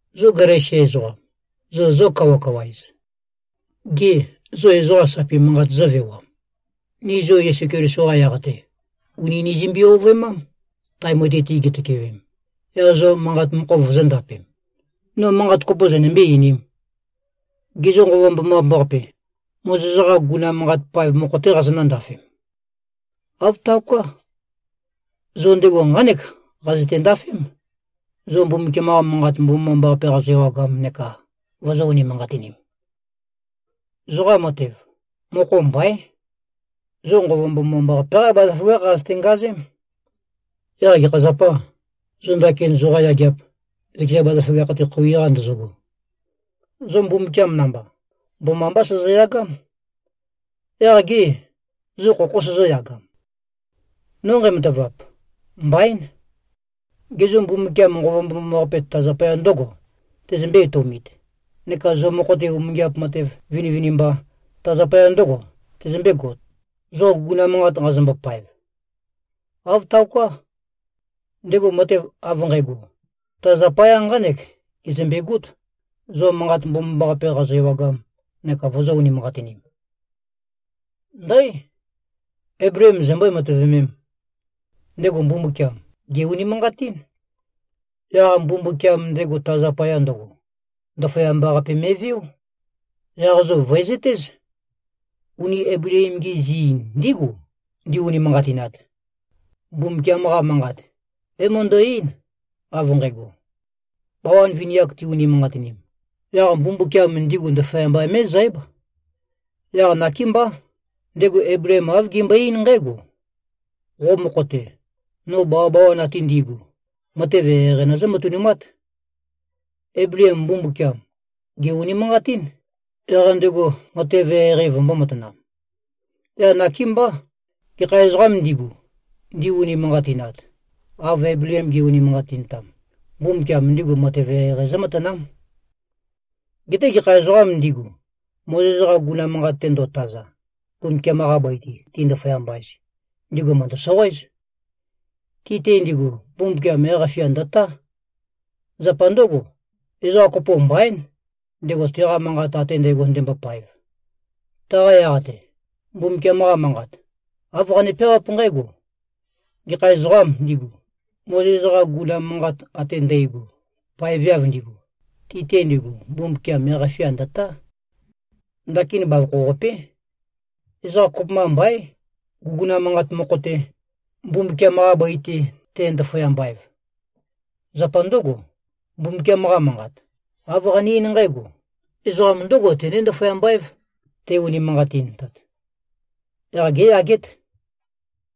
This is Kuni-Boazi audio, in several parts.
Zo Galesia ezoqam, zo zó-kawakawa-ez? Gê, zo ezoqa sapi manqāt zǿvewam? Ni zo Yesu Keliso-qa yaq-te, ùni nizømbe-ovøemám, tae mutui-te gitøkewem, yaq zo manqa mokho vozōndapem. No manqat kopo zønømbé-einīm? Gê, zo Nqova Mbomambaqape, Mozes-qa guguna manqat paev mokho-té qazonǿ-ndafem? Āv taoká. Zo ndego nqánek qazøte-ndafém, zo Mbumbukiam-qa Manqat Mbomambaqape qazo-ewagam neka vozō-unimanqatinim. Zoqa matev, mokho mbaín. Zo Nqova Mbomambaqape-qá bazaføgákh qazøte-ngazém. Yaq gekha zapâ, zo ndakin zoqa yageap, zøkeza bazaføgakh-te khoui-qa ndozogo? Zo Mbumbukiam namba, mbomambá sozoyagám. Yaq gê, zo khokhó sozóyagam? No nqæmatavap, mbaín! Gê, zo Mbumbukiam Nqova Mbomambaqape ta zapaya ndǿgo tezømbé-etoumit, neka zo mokho-te umingiap matev vinivinimba, ta zapaya ndǿgo tezømbégot, zo guguna manqat nqazombo-paev? Āv taoká. Ndego matev av nqægo, ta zapaya nqánek gezømbegót, zo Manqat Mbomambaqape qazo-ewagam neka vozō-unimanqatinim. Ndǽ! Eibleem zombǿe-matøvemēm? Ndego Mbumbukiam, gè-unimanqatín. Yaq Mbumbukiam ndego ta zapaya ndøgo, ndaføyamba-qape me꞉veó. Yaq zo vø̀ezøtéz: Uni Eibleem-gi zi ndígu, ndi-unimanqatinat. Mbumbukiam-qa Manqat, é-møndø-eín, av nqægo: Bawan vini-ak ti-unimanqatinim, yaq Mbumbukiam ndigu ndaføyamba mé꞉zǽb. Yaq nakémbá, ndego Eibleem āv gembøe-eín nqǽgo, “Qo mokho-te, no bawabawan ate ndi꞉gu, matev eqeieqei nøzǿ-matønumát.” Eibleem Mbumbukiam, gè-unimanqatín, yaq ndego matev eqeieqei vømbō-matanam. Yaq nakémbá, gekha ezoqām ndigu, ndi-unimanqatinat, av Eibleem ge꞉-unimanqatintam, Mbumbukiam ndigu matev eqeieqei zǿmatanám. Geté gekha ezoqām ndigu, Mozes-qa guguna manqat-te ndo꞉taza, Mbumbukiam-qa bøi-te ti-ndaføyamba-ez, ndigu mø̀ndø-soqoéz. Ti-te ndigu Mbumbukiam yaq-fia ndø̀tá. Zapa ndǿgo, ezoqa kopo mbaín, ndego teqa manqat ate ndægo ndembopaev. Taqa yaq-te, Mbumbukiam-qa Manqat, āv qane-peawáp nqǽgo: Gekha ezoqām ndigu, Mozes-qa guguna manqat ate ndægo paeveav ndigu, ti-te ndigu Mbumbukiam yaq-fia ndø̀tá. Ndakin bavokho-qapé. Ezoqa kopømba mbaín, guguna manqat mokho-te, Mbumbukiam-qa bøi-te te-ndaføyamba-ev. Zapa ndǿgo, Mbumbukiam-qa Manqat, āv qane-eín nqǽgo: Ezoqam ndǿgo tené-ndaføyamba-év, te-unimanqatintat. Yaq géyagét.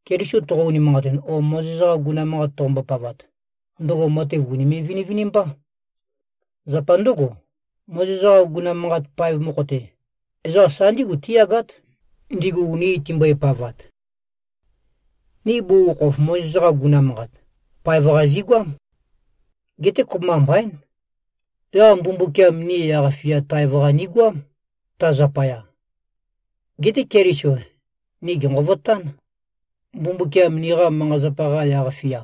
Keliso toqo-unimanqatin o Mozes-qa guguna manqat toqombo-pavat, ndøgo matev ùnime꞉-vinivinimbá. Zapa ndǿgo, Mozes-qa guguna manqat paev mokho-te, ezoqa sa ndígu tíyagát, ndigu uni timbøepavat. Ni bugukhokhof Mozes-qa guguna manqat, paev-qa zigoám. Geté kopømba mbaín. Yaq Mbumbukiam ni yaq-fia taev-qa nigoám, ta zapaya. Geté Keliso ni gènqovotán. Mbumbukiam niqa manqa-zapa-qa yaq-fia,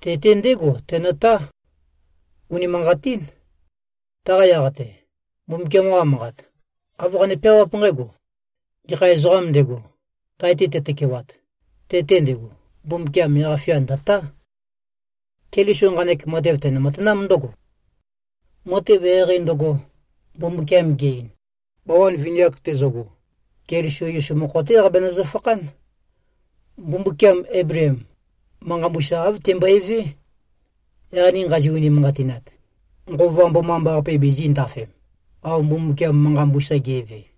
te-te ndégo tenøtá. Unimanqatín. Taqa yaq-te, Mbumbukiam-qa Manqat, āv qane-peawáp nqǽgo, “Gekha ezoqām ndego, tae-te tetøkewat, te-te ndego, Mbumbukiam yaq-fia ndø̀tá.” Keliso nqanek matev tene-matanám ndǿgo: Matev eqeieqei ndøgo, Mbumbukiam ge-ein, bawan vini-ak tezøgo, Keliso Yesu mokho-té qabenøzø-fakhán. Mbumbukiam Eibleem, manqa mbusa āv tembøevé. Yaq ni nqazi-unimanqatinat, Nqova Mbomambaqape bizī꞉ndafem, av Mbumbukiam manqa mbusa ge꞉ve.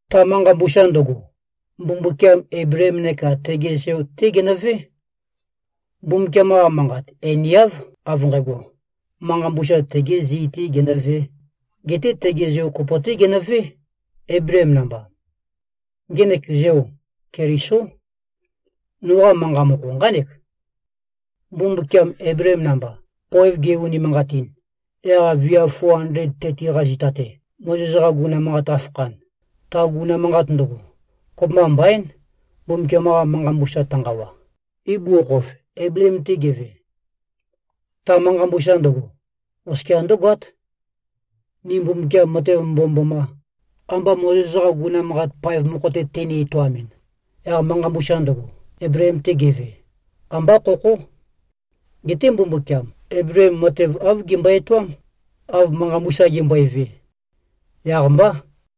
Ta manqa mbusa ndøgo, Mbumbukiam Eibleem neka tege zeo-té genøvé. Mbumbukiam-qa Manqat einiáv av nqægo, manqa mbusa tegi zi-tē genøvē, geté tege zeo kopo-té genøvé, Eibleem namba. Ngenek zeo, Kelisó. Noqa manqa mokho nqánek: Mbumbukiam Eibleem namba, poev ge-unimanqatin, yaq viav 430-qa zita-te, Mozes-qa guguna manqat qafakhan, ta guguna manqat ndøgo, kopømba mbaín, Mbumbukiam-qa manqa mbusa tønqawa, ibugukhokhof Eibleem-te geve. Ta manqa mbusa ndøgo, oskia ndǿgoát. Ni Mbumbukiam matev mbomømboma, amba Mozes-qa guguna manqat paev mokho-te teni-etoamɨn, yaq manqa mbusa ndøgo, Eibleem-te geve, ambá khokhó. Geté Mbumbukiam Eibleem matev āv gembøe-etoám, av manqa mbusa gembøeve. Yaq-mbá.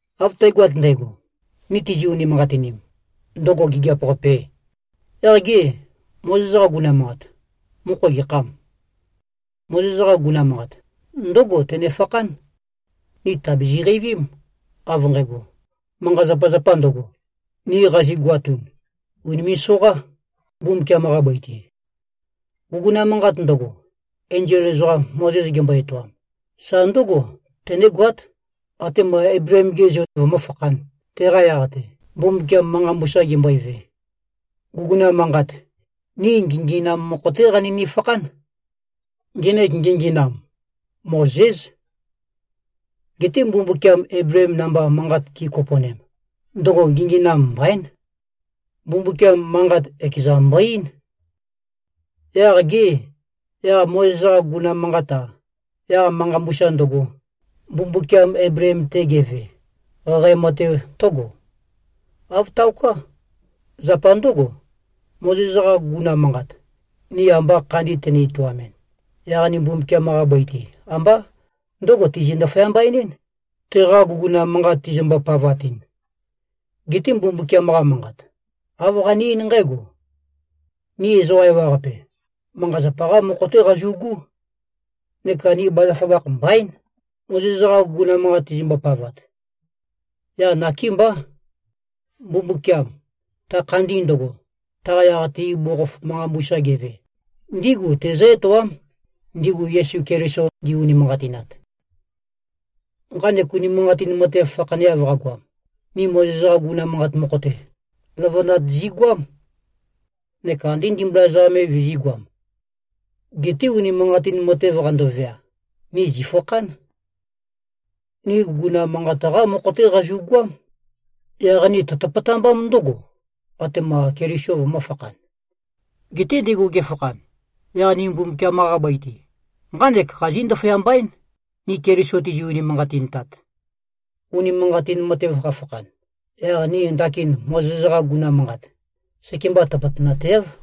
Av tægoat ndægo, ni tizi-unimanqatinim, ndøgo gigiap-qapē, yaq gê, Mozes-qa guguna manqat, mokho gekhâm? Mozes-qa guguna manqat, ndǿgo tønefakhán: Ni tàbizi-qeivím, av nqægo, manqa-zapazapa ndøgo, ni qazigoatun, ùnime꞉-soqá, Mbumbukiam-qa bøi-te. Guguna manqat ndøgo, enzol ezoqam Mozes gembo-etoam, sa ndǿgo tønégoát, atema Eibleem-ge zeo vømǿfakhān, teqa yaq-te, Mbumbukiam manqa mbusa gembøeve. Guguna manqat, ni nginginam mokho-té qanøni-fakhán. Ngenek nginginam, Mozés. Geté Mbumbukiam Eibleem namba manqat gi꞉kopo꞉nem, ndøgo nginginam mbaín. Mbumbukiam manqat ekezan mbo-eín. Yaq gê, yaq Mozes-qa guguna manqat-a, yaq manqa mbusa ndøgo, Mbumbukiam Eibleem-te geve, qaqae matev tǿgo? Āv taoká. Zapa ndǿgo, Mozes-qa guguna manqat, ni amba khandi tøni-etoamɨn, yaq ni Mbumbukiam-qa bøi-te, ambá ndǿgo tizi꞉-ndaføyamba-enɨ́n, teqa guguna manqat tizimbo-pavatɨn. Geté Mbumbukiam-qa Manqat, āv qane-eín nqǽgo: Ni ezoqa ewaqape, manqa-zapa-qá mokho-té qazu꞉gú, neka ni bazaføgakh mbaín, Mozes-qa guguna manqat tizimbo-pavat. Yaq nakémbá, Mbumbukiam, ta khandi ndøgo, taqa yaq-te ibugukhokhof manqa mbusa geve, ndígu tezǿ-etoám, ndigu Yesu Keliso ndi-unimanqatinat. Nqanek unimanqatin matev fakhaneav qagoam, ni Mozes-qa guguna manqat mokho-te, løvønat zigoám, neka ande ndimbula ezoqam me vizī꞉goam. Geté unimanqatin matev qandovea, ni zìfakhán. Ni guguna manqat-qá mokho-té qazu꞉goám. Yaq ni tøtøpøtambám ndǿgo, atema Keliso vømø̄fakhan. Geté ndego gefakhan, yaq ni Mbumbukiam-qa bøi-te, nqánek qazí꞉-ndaføyamba-én, ni Keliso tizi꞉-unimanqatintat. Unimanqatin matev qafakhan, yaq ni ndakin Mozes-qa guguna manqat, sekemba tøpøtønateáv.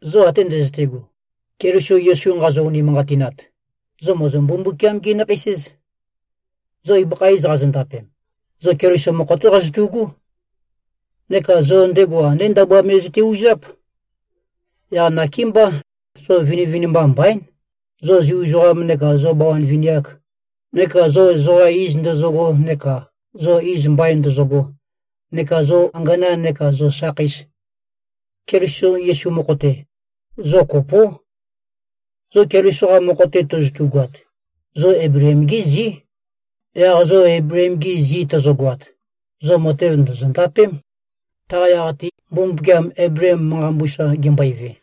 Zo ate ndøzøte꞉go, Keliso Yesu nqazo-unimanqatinat, zo mòzo-Mbumbukiam-gí-nakheis-éz. Zo ibøkha iz qazondapem, zo Keliso mokho-té qazotu꞉gú. Neka zo ndego andé ndabua me zøte-uzáp. Yaq nakémbá zo vinivinimba mbaín, zo Zu ezoqam neka zo bawan vini-ak, neka zo ezoqa iz ndøzøgo neka zo iz mbain ndozogo, neka zo angana neka zo sakheis. Keliso Yesu mokho-te, zo kopó. Zo Keliso-qa mokho-te tozotugoat, zo Eibleem-gí zí. Yaq zo Eibleem-gi zi tozogoat, zo matev ndòzo-ndapém, taqa yaq-te, Mbumbukiam Eibleem manqa mbusa gembøeve.